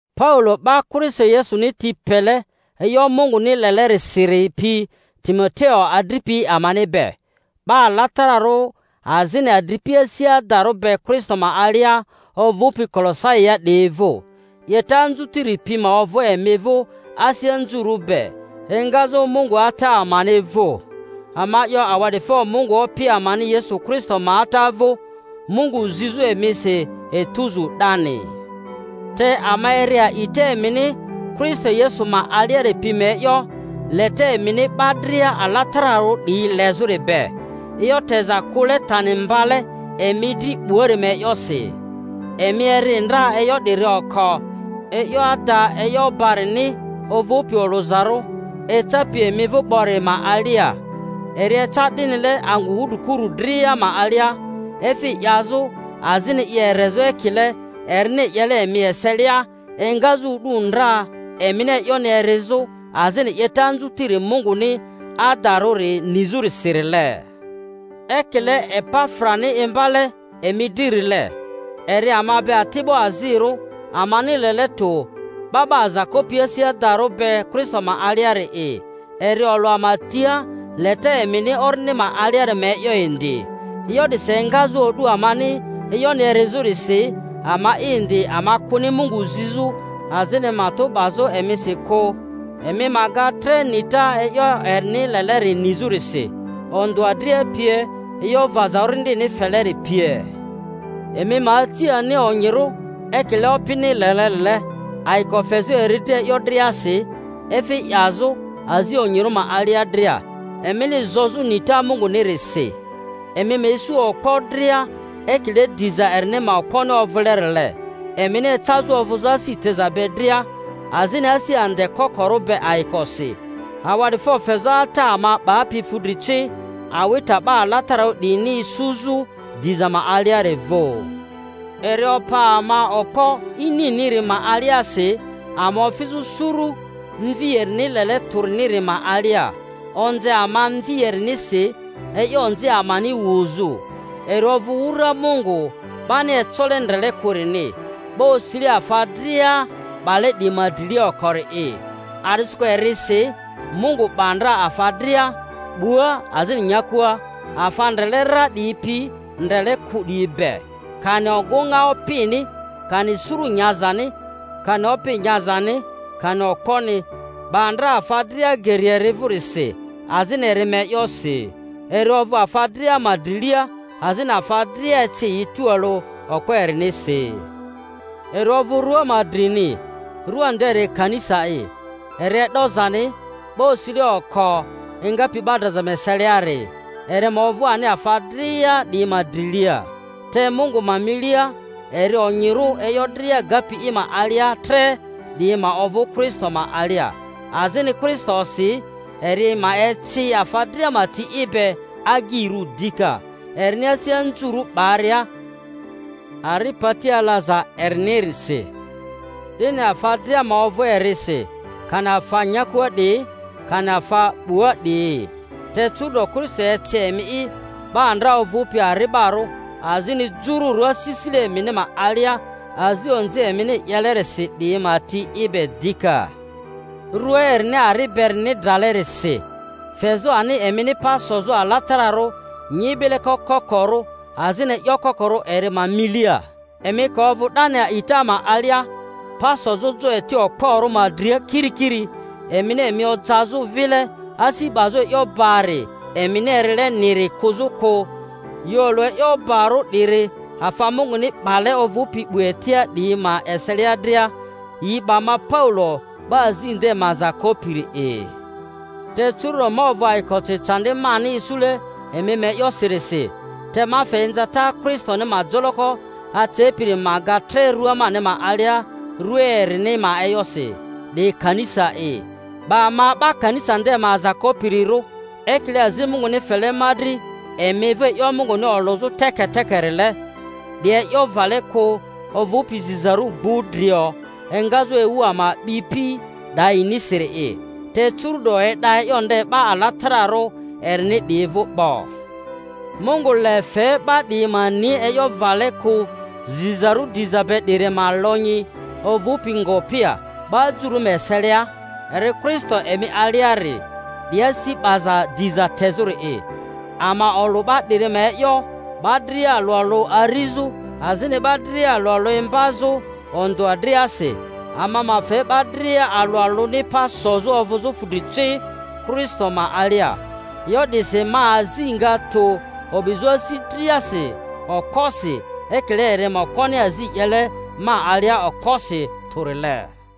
Paulo, 'ba Kristo Yesuni ti pele e'yo Munguni lelerisiri pi Timo-teo adripi amani be, 'Ba alatararᴜ azini adripi asi adarᴜ be Kristo ma alia ovᴜpi Kolosaia 'diyi vᴜ: 'Yeta anzutiri pi ma ovᴜ emi vᴜ asi anzurᴜ be, engazᴜ Mungu Ata amani vᴜ. Ama 'yo awa'difo Mungu Opi amani Yesu Kristo ma Ata vᴜ, Mungu zizᴜ emisi etuzu 'dani. Te ama eri a'ita emini Kristo Yesu ma aliari pi ma e'yo, leta emini 'ba dria alatararᴜ 'diyi lezᴜri be, e'yo teza kᴜle tani mbale emi dri 'buari ma e'yosi. Emi eri ndra e'yo 'diri oko e'yo ada e'yo barini ovᴜpi olᴜzarᴜ, ecapi emi vᴜ 'bori ma alia. Eri eca 'dinile angᴜ wudrikurᴜ dria ma alia, efi 'yazᴜ azini i erezᴜ ekile erini 'yele emi eselia engazᴜ o'du ndra emini e'yoni erizᴜ azini 'yeta anzutiri Munguni adarᴜri nizᴜrisirile, ekile Epafrani imba-le emi dririle. Eri ama be ati'bo azirᴜ amani lele tᴜ, 'ba 'ba aza kopi asi adarᴜ be Kristo ma aliari'i; eri olᴜ ama tia leta emini Orindi ma aliari ma e'yo indi. E'yo 'disi engazᴜ o'du amani e'yoni erizᴜrisi, ama'i indi ama kᴜni Mungu zizᴜ azini matᴜ 'bazᴜ emisi kᴜ, emi ma ga tre nita e'yo erini leleri nizᴜrisi, ondᴜa dria pie, e'yo vaza Orindini feleri pie, emi ma aci ani onyirᴜ ekile Opini lelerile, ayiko fezᴜ eri dri e'yo driasi, efi 'yazᴜ azi onyirᴜ ma alia dria, emini zozᴜ nita Mungunirisi. Emi ma isu okpo dria ekile diza erini ma okponi ovᴜle-rile, emini ecazᴜ ovᴜzᴜ asi teza be dria, azini asi ande kokorᴜ be ayikosi, awa'difo fezᴜ Ata ama 'bapi fudri ci awita 'ba alatararᴜ 'diyini isuzᴜ diza ma aliari vᴜ. Eri opa ama okpo ininiri ma aliasi, ama ofizᴜ suru Mvi erini lele tᴜriniri ma alia; onze ama Mvi erinisi e'yo onzi amani wuzᴜ. Eri ovᴜ wura Mungu 'bani ecole ndrele kᴜrini, 'ba osile afa dria 'bale 'diyi ma drilia okori'i; a’disikᴜ erisi Mungu 'ba ndra afa dria, 'bua azini nyakua, afa ndrele ra 'diyi pi ndrele kᴜ 'diyi be, kani ogᴜŋa opini, kani suru nyazani, kani opi nyazani, kani okponi—'ba ndra afa dria geri eri vᴜrisi, azini eri ma e'yosi. Eri ovᴜ afa dria ma drilia, azini afa dria eci yi tualᴜ okpo erinisi. Eri ovᴜ rᴜa ma drini, rua nderi kanisa'i; eri e'dozani, 'ba osile oko engapi 'ba draza ma eseliari, eri ma ovᴜ ani afa dria 'diyi ma drilia. Te Mungu ma milia eri onyirᴜ e'yo dria gapi i ma alia tre 'diyi ma ovᴜ Kristo ma alia, azini Kristo-si eri ma eci afa dria ma ti i be agyirᴜ dika, erini asi anzurᴜ 'baria ari pati alaza erinirinisi, 'dini afa dria ma ovᴜ erisi, kani afa nyakua 'diyi kani afa 'bua 'diyi. Te curu’do Kristo eci emi'i 'ba ndra ovᴜpi ari'barᴜ azini jururᴜ asisile emini ma alia azi onzi emini 'yelerisi 'diyi ma ti i be dika rᴜa erini ari berini dralerisi, fezᴜ ani emini pa sozᴜ alatararᴜ nyibile kokorᴜ azini e'yo kokorᴜ eri ma milia, emi ka ovᴜ 'dani a'ita ma alia, pa sozᴜ jo eti okporᴜ ma dria kirikiri, emini emi ojazᴜ vile asi 'baza e'yo bari emini erileriniri kᴜzᴜ kᴜ. Yi olᴜ e'yo barᴜ 'diri afa Munguni 'bale ovᴜpi 'bu etia 'diyi ma eselia dria; yi 'ba ma, Paulo, 'ba azi nde ma aza kopiri'i. Te curu’do ma ovᴜ ayikosi candi mani isule emi ma e'yosirisi, te ma fe inzata Kristoni ma joloko acepiri ma ga tre rᴜa mani ma alia rᴜa erini ma e'yosi, 'di kanisa'i. 'Ba ma 'ba kanisa nde ma aza kopirirᴜ, ekile azi Munguni fele ma dri emi vᴜ e'yo Munguni olᴜzᴜ teketekerile, 'di e'yo vale kᴜ ovᴜpi zizarᴜ gbudrio engazᴜ ewu ama a'bipi 'dayinisiri'i, te curu'do e'da e'yo nde 'ba alatararᴜ erini 'diyi vᴜ 'bo. Mungu le fe 'ba 'diyi ma ni e'yo vale kᴜ zizarᴜ diza be 'diri ma lonyi ovᴜ ngopi ya 'ba jururᴜ ma eseilia, eri Kristo emi aliari, 'di asi 'baza diza tezᴜri'i. Ama olᴜ 'ba 'diri ma e'yo, 'ba dria alᴜ alᴜ arizᴜ, azini 'ba dria alᴜ alᴜ imbazᴜ ondᴜa driasi, ama ma fe 'ba dria alᴜ alᴜni pa sozᴜ ovᴜzᴜ fudri ci Kristo ma alia. E'yo 'disi ma azi nga tᴜ, o'bizᴜ asi driasi okposi, ekile eri ma okponi azi 'yele ma alia okposi tᴜrile.